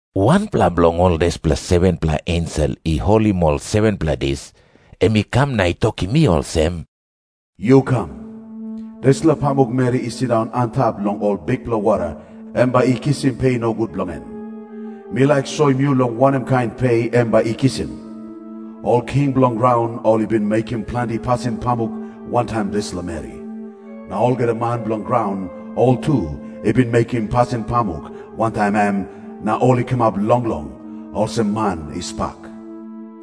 Wanpela bilong ol dispela 7-pela ensel i holim ol 7-pela dis, em i kam na i tokim mi olsem, “Yu kam. Dispela pamukmeri i sindaun antap long ol bikpela wara, em bai i kisim pe nogut bilong en. Mi laik soim yu long wanem kain pe em bai i kisim. Ol king bilong graun ol i bin mekim planti pasin pamuk wantaim dispela meri. Na olgeta man bilong graun ol tu i bin mekim pasin pamuk wantaim em, na ol i kamap longlong, olsem man i spak.”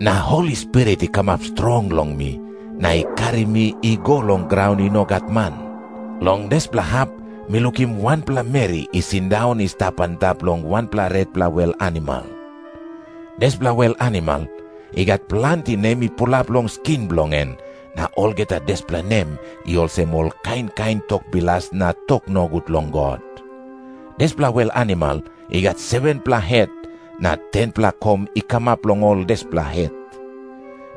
Na Holi Spirit i kamap strong long mi, na i karim mi i go long graun i no gat man. Long dispela hap mi lukim wanpela meri i sindaun i stap antap long wanpela retpela wel animal. Dispela wel animal i gat planti nem i pulap long skin bilong en, na olgeta dispela nem i olsem ol kain kain tok bilas na tok nogut long God. Dispela wel animal i gat 7-pela het, na 10-pela kom i kamap long ol dispela het.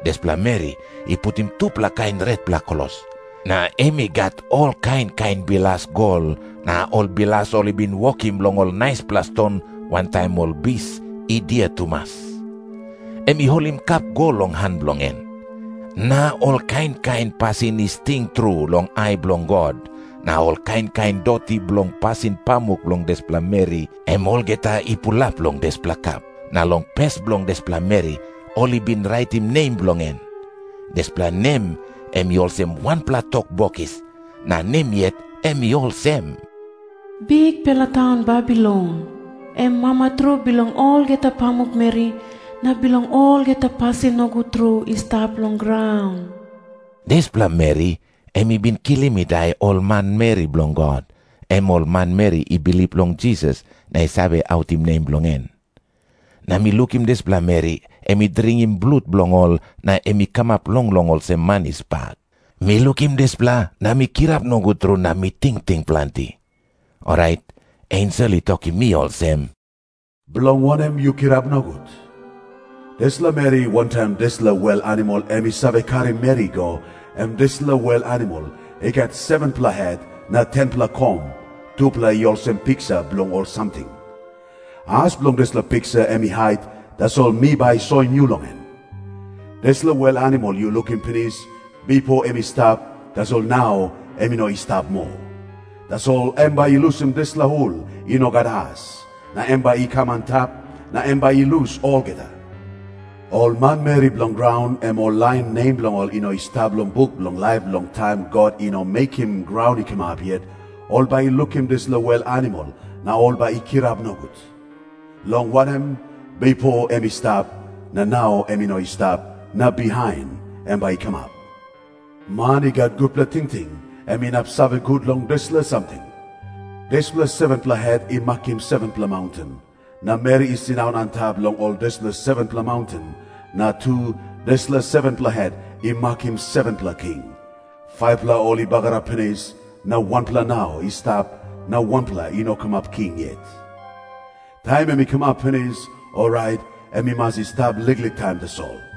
Dispela meri i putim tupela kain retpela klos, na em i gat ol kain kain bilas gol na ol bilas ol i bin wokim long ol naispela ston wantaim ol bis i dia tumas. Em i holim kap gol long han bilong en. Na ol kain kain pasin i sting tru long ai bilong God na ol kain kain doti bilong pasin pamuk bilong dispela meri, em olgeta i pulap long dispela kap. Na long pes bilong dispela meri ol i bin raitim nem bilong en. Dispela nem em i olsem wanpela tok bokis, na nem yet em i olsem, “Bikpela taun Babilon, em mama tru bilong olgeta pamukmeri na bilong olgeta pasin nogut tru i stap long graun.” Dispela meri em i bin kilim i dai ol manmeri bilong God, em ol manmeri i bilip long Jisas na i save autim nem bilong en. Na mi lukim dispela meri em i dringim blut bilong ol na em i kamap longlong olsem man i spak. Mi lukim dispela na mi kirap nogut tru na mi tingting planti. Orait ensel i tokim mi olsem, “Bilong wanem yu kirap nogut? Dispela meri wantaim dispela wel animal em i save karim meri i go, em dispela wel animal i gat 7-pela het na 10-pela kom, tupela i olsem piksa bilong ol samting. As bilong dispela piksa em i hait, tasol mi bai soim yu long en. Dispela wel animal yu lukim pinis, bipo em i stap, tasol nau em i no i stap moa. Tasol em bai i lusim dispela hul i no gat as, na em bai i kam antap, na em bai i lus olgeta. Ol manmeri bilong graun, em ol lain nem bilong ol i no i stap long buk bilong laip long taim God i no mekim graun i kamap yet, ol bai i lukim dispela wel animal na ol bai i kirap nogut. Long wanem, bipo em i stap, na nau em i no i stap, na bihain em bai i kamap. “Man i gat gutpela tingting, em inap save gut long dispela samting. Dispela 7-pela het i makim 7-pela maunten. Na meri i sindaun antap long ol dispela 7-pela maunten. Na tu, dispela 7-pela het i makim 7-pela king. 5-pela ol i bagarap pinis, na wanpela nau i stap, na wanpela i no kamap king yet. Taim em i kamap pinis, orait em i mas i stap liklik taim tasol.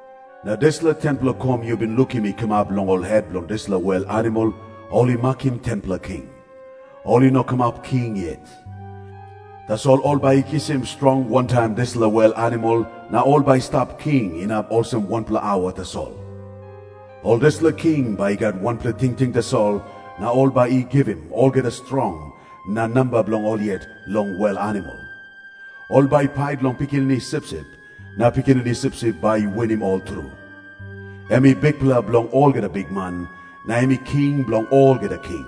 “Na dispela 10-pela kom yu bin lukim i kamap long ol het bilong dispela wel animal, ol i makim 10-pela king. Ol i no kamap king yet. Tasol ol bai i kisim strong wantaim dispela wel animal, na ol bai i stap king inap olsem wanpela aua tasol. Ol dispela king bai i gat wanpela tingting tasol, na ol bai i givim olgeta strong na namba bilong ol yet long wel animal. Ol bai i pait long Pikinini Sipsip, na Pikinini Sipsip bai i winim ol tru. Em i Bikpela bilong olgeta bikman, na em i King bilong olgeta king.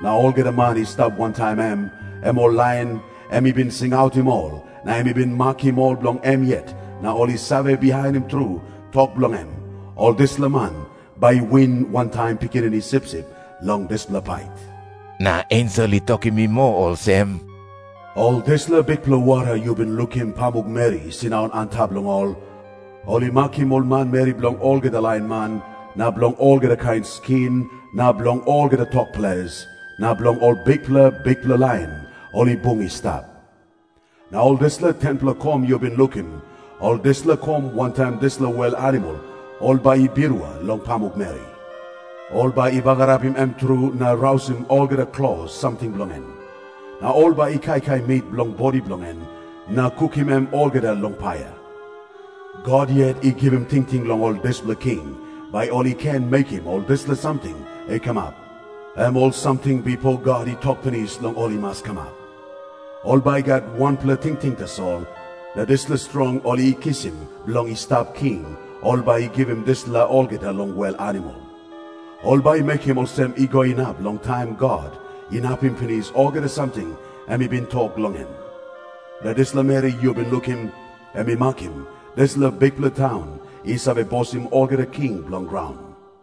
Na olgeta man i stap wantaim em, em ol lain em i bin singautim ol na em i bin makim ol bilong em yet na ol i save bihainim tru tok bilong em, ol dispela man bai i win wantaim Pikinini Sipsip long dispela pait.” Na ensel i tokim mi moa olsem, “Ol dispela bikpela wara yu bin lukim pamukmeri i sindaun antap long ol, ol i makim ol manmeri bilong olgeta lain man na bilong olgeta kain skin na bilong olgeta tok ples na bilong ol bikpela bikpela lain ol i bung i stap. Na ol dispela 10-pela kom yu bin lukim, ol dispela kom wantaim dispela wel animal ol bai i birua long pamukmeri. Ol bai i bagarapim em tru na rausim olgeta klos samting bilong en. Na ol bai i kaikai mit bilong bodi bilong en, na kukim em olgeta long paia. God yet i givim tingting long ol dispela king, bai ol i ken mekim ol dispela samting i kamap, em ol samting bipo God i tok pinis long ol i mas kamap. Ol bai i gat wanpela tingting tasol, na dispela strong ol i kisim bilong i stap king, ol bai i givim dispela olgeta long wel animal. Ol bai i mekim olsem i go inap long taim God inapim pinis olgeta samting em i bin tok long en. Na dispela meri yu bin lukim, em i makim dispela bikpela taun i save bosim olgeta king bilong graun.”